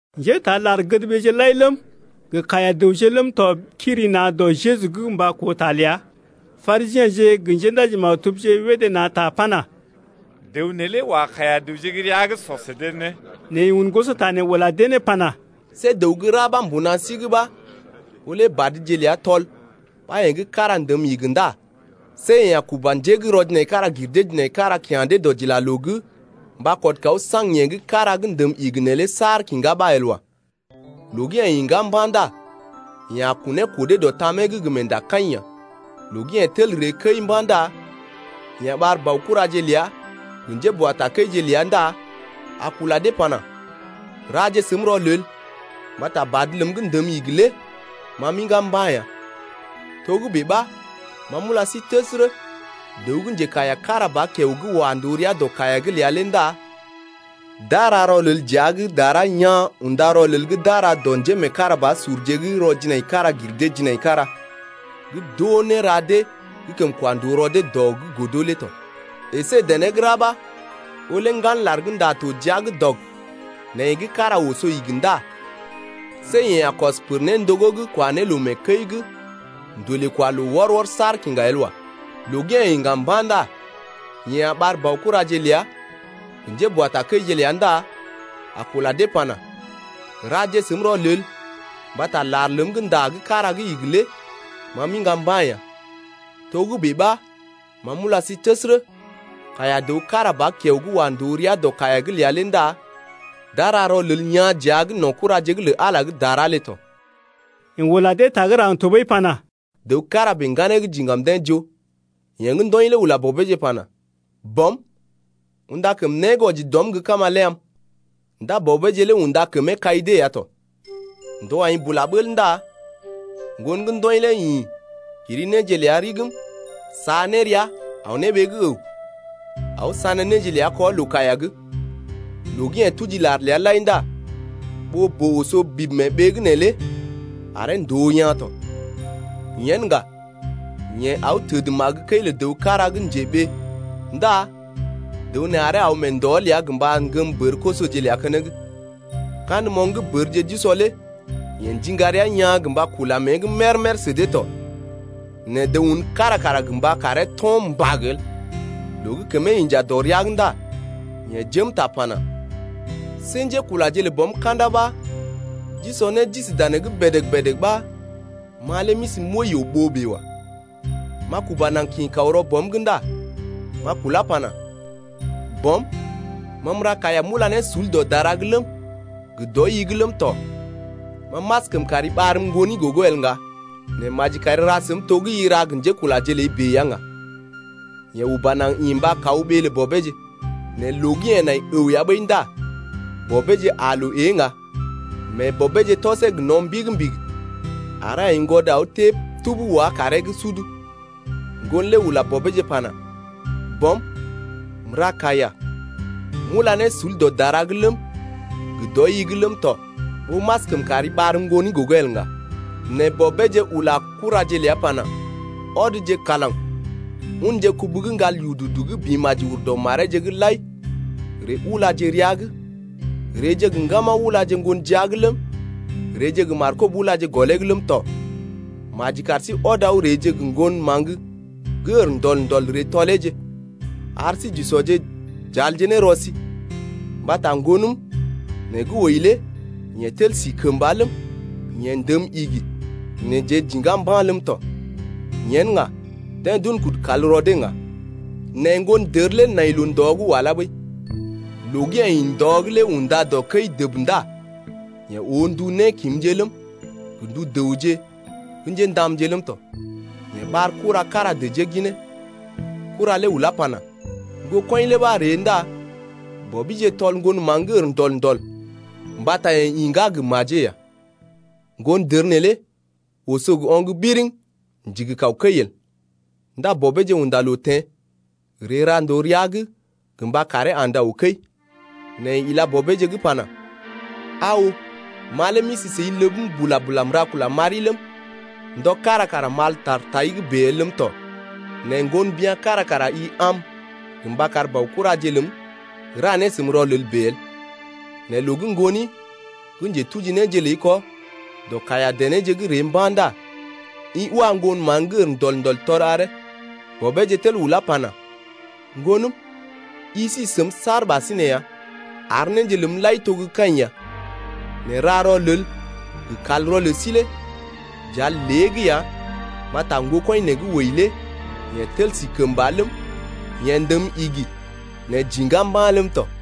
Njétaa lar-gədɓeeje lai ləm gə kaiya-dəwje ləm tɔ kiri na̰ dɔ Jeju’g mba koo ta ləa. Parisiḛje gə njéndaji-maktubje wédé na̰ ta pana: Dəw neelé wa kaiya-dəwje gə́ rəa’g sɔ sə dee né. Nɛ yeḛ un gosota nee ula dee ne pana: See dəw gə́ ra ɓa mbuna sí’g ɓa ɓó lé badje ləa tɔl ɓa yee gə́ kára ndəm igi ndá see yeḛ a kuba njé gə́ rɔ-jinaikara-gir-dee-jinaikara kya̰ dee dɔdilaloo’g mba kɔd kaw saŋg yee gə́ kára gə́ ndəm igi neelé saar kiŋgá ɓa el wa. Loo gə́ yeḛ iŋgá mba̰ ndá yeḛ a kunee kɔdee dɔ tamee’g gə meendakaḭ ya. Loo gə́ yeḛ tel ree kəi mba̰ ndá yeḛ a ɓar baokuraje ləa gə njéboatakəije ləa ndá a kula dee pana: Raje səm rɔlel mbata badə ləm gə́ ndəm igi lé ma m’iŋgá mba̰ ya. Togə́bè ɓa ma m’ula sí təsərə, dəw gə́ njekaiya kára ba kiao gə́ wa ndòo rəa dɔ kaiya’g ləa lé ndá d’a ra rɔlel dəa’g dara yaa̰ unda rɔlel gə́ d’a ra dɔ njémeekarabasurje gə́ rɔ-jinaikara-gir-dee-jinaikara gə́ d’oo néra dee gə́ kəm kwa ndòo rɔ dee dɔ’g godo lé tɔ. Ǝsé dené gə́ ra ɓa ɓó lé ŋgan lar gə́ ndá to jia’g dɔg nɛ yee gə́ kára oso igi ndá see yeḛ a kɔs néndogó’g kwa ne loo mee kəi’g, ndolee kwa loo wɔr-wɔr saar kiŋga el wa. Loo gə́ yeḛ iŋga mba̰ ndá yeḛ a ɓar baokuraje ləa gə njéboatakəije ləa ndá a kula dee pana: Raje səm rɔlel mbata lar ləm gə́ ndá gə́ kára gə́ igi lé ma m’iŋga mba̰ ya. Togə́bè ɓa ma m’ula sí təsərə, kaiya-dəw kára ba kiao gə́ wa ndòo rəa dɔ kaiya’g ləa lé ndá d’a ra rɔlel yaa̰ dəa’g no̰ kuraje lə Ala gə́ dara lé tɔ. Yeḛ ula dee ta gə́ raŋg tɔɓəi pana: Dəw kára bèe ŋganee gə́ diŋgam deḛ joo. Yeḛ gə́ ndɔḭ lé ula bɔbeeje pana: Bɔm, unda kəm né gə́ wɔji dɔm gə́ kama lé am. Ndá bɔbeeje lé unda kəmee kai dee ya tɔ. Ndɔje aḭ bula bəl ndá ŋgon gə́ ndɔḭ lé ḭ kiri néje ləa rigim sa ne rəa aw ne ɓee gə́ əw, aw sané néje ləa kɔ loo-kaiya’g. Loo gə́ yeḛ tuji lar ləa lai ndá ɓoo-boo oso bib mee ɓee’g neelé aree ndòo yaa̰ tɔ. Yen ŋga yeḛ aw təd magə kəi lə dəw kára gə́ njeɓee ndá dəw nee aree aw ndɔ ləa gə́ mba ŋgəm bər-kosoje ləa keneŋ. Kandə moŋg gə́ bərje d’usɔ lé yeḛ ndiŋga rəa yaa̰ gə mba kula mée’g mér-mér sə dee tɔ, nɛ dəw un kára kara gə mba karee to̰ mbag el. Loo gə́ kəmee inja dɔ rəa’g ndá yeḛ jém ta pana: See njékulaje lə bɔm ka̰da ɓa d’usɔ né d’isi danee’g bèdèg-bèdèg ɓa ma lé m’isi m’wəi yoo-ɓoo bèe wa. M’a kuba naŋg kḭ kaw rɔ bɔm’g ndá m’a kulá pana: Bɔm, ma m’ra kaiya m’ula ne sul dɔ dara’g ləm, gə dɔi-i’g ləm tɔ. Ma m’askəm kari ɓarm ŋgoni gogo el ŋga, nɛ maji kari ra səm to gə́ i ra gə njékulaje ləi bèe ya ŋga. Yeḛ uba naŋg ḭ mba kaw ɓee lə bɔbeeje lé. Nɛ loo gə́ yeḛ nai əw ya ɓəi ndá bɔbeeje aa loo ée ŋga mee bɔbeeje tɔsee gə no̰ mbigi-mbigi aree aiŋgwɔd aw tée tub wá kaaree’g sud. Ŋgon lé ula bɔbeeje pana: Bɔm, m’ra kaiya, m’ula ne sul dɔ dara’g ləm, gə dɔi-i’g ləm tɔ ɓó m’askəm kari ɓarm ŋgoni gogo el ŋga Nɛ bɔbeeje ula kuraje ləa pana: Ɔdje kalaŋ unje kubu gə́ ŋgal yududu gə́ bḭ maji ur dɔ mareeje’g lai ree ulaje rəa’g, reeje gə ŋgama ulaje ŋgon jia’g ləm, reeje gə markob ulaje gɔlee’g ləm tɔ. Maji kar sí ɔd aw reeje gə ŋgon maŋg gə́ ər ndɔl-ndɔl ree tɔleeje. Ar sí j’usɔje j’alje ne rɔ sí. Mbata ŋgonəm nee gə́ wəi lé yeḛ tel si kəmba ləm, yeḛ ndəm igi né jeḛ j’iŋgá mba̰ ləm tɔ. Yen ŋga deḛ d’un kudu kal rɔ dee ŋga. Nɛ ŋgondər lé nai loo-ndɔ’g walá ɓəi. Loo gə́ yeḛ ḭ ndɔ’g lé unda dɔ kəi dəb ndá yeḛ oo ndu nékimje ləm, gə ndu dəwje gə́ njéndamje ləm tɔ. Yeḛ ɓar kura kára dəjee ginee. Kura lé ulá pana: Ŋgokɔḭ lé ɓa ree ndá bɔbije tɔl ŋgon maŋg gə́ ər ndɔl-ndɔl mbata yeḛ iŋgá gə́ majee ya. Ŋgondər neelé oso gə oŋg biriŋ, ndigi kaw kəi el. Ndá bɔbeeje unda loo teḛ, ree ra ndòo rəa’g gə mba karee andə aw kəi. Nɛ yeḛ ila bɔbeeje’g pana: Aa oo, ma lé m’isi səi ləbm bula-bula m’ra kula m’ari ləm, ndɔ kára kara m’al ta tai’g bèe el ləm tɔ. Nɛ ŋgon bya̰ kára kara i am gə mba kar baokuraje ləm ra ne səm rɔlel bèe el. Nɛ loo gə́ ŋgoni gə́ njetuji néje ləi kɔ dɔ kaiya-denéje’g ree mba̰ ndá i wa ŋgon maŋg gə́ ər ndɔl-ndɔl tɔl aree. Bɔbeeje tel ulá pana: Ŋgonəm, i si səm saar ɓasinè ya ar néje ləm lai to gə́ kaḭ ya, nɛ ra rɔlel gə kalrɔ lə sí lé j’al lée’g ya mbata ŋgokɔḭ nee gə́ wəi lé yeḛ tel sí kəmba ləm, yeḛ ndəm igi nɛ j’iŋgá mba̰ ləm tɔ.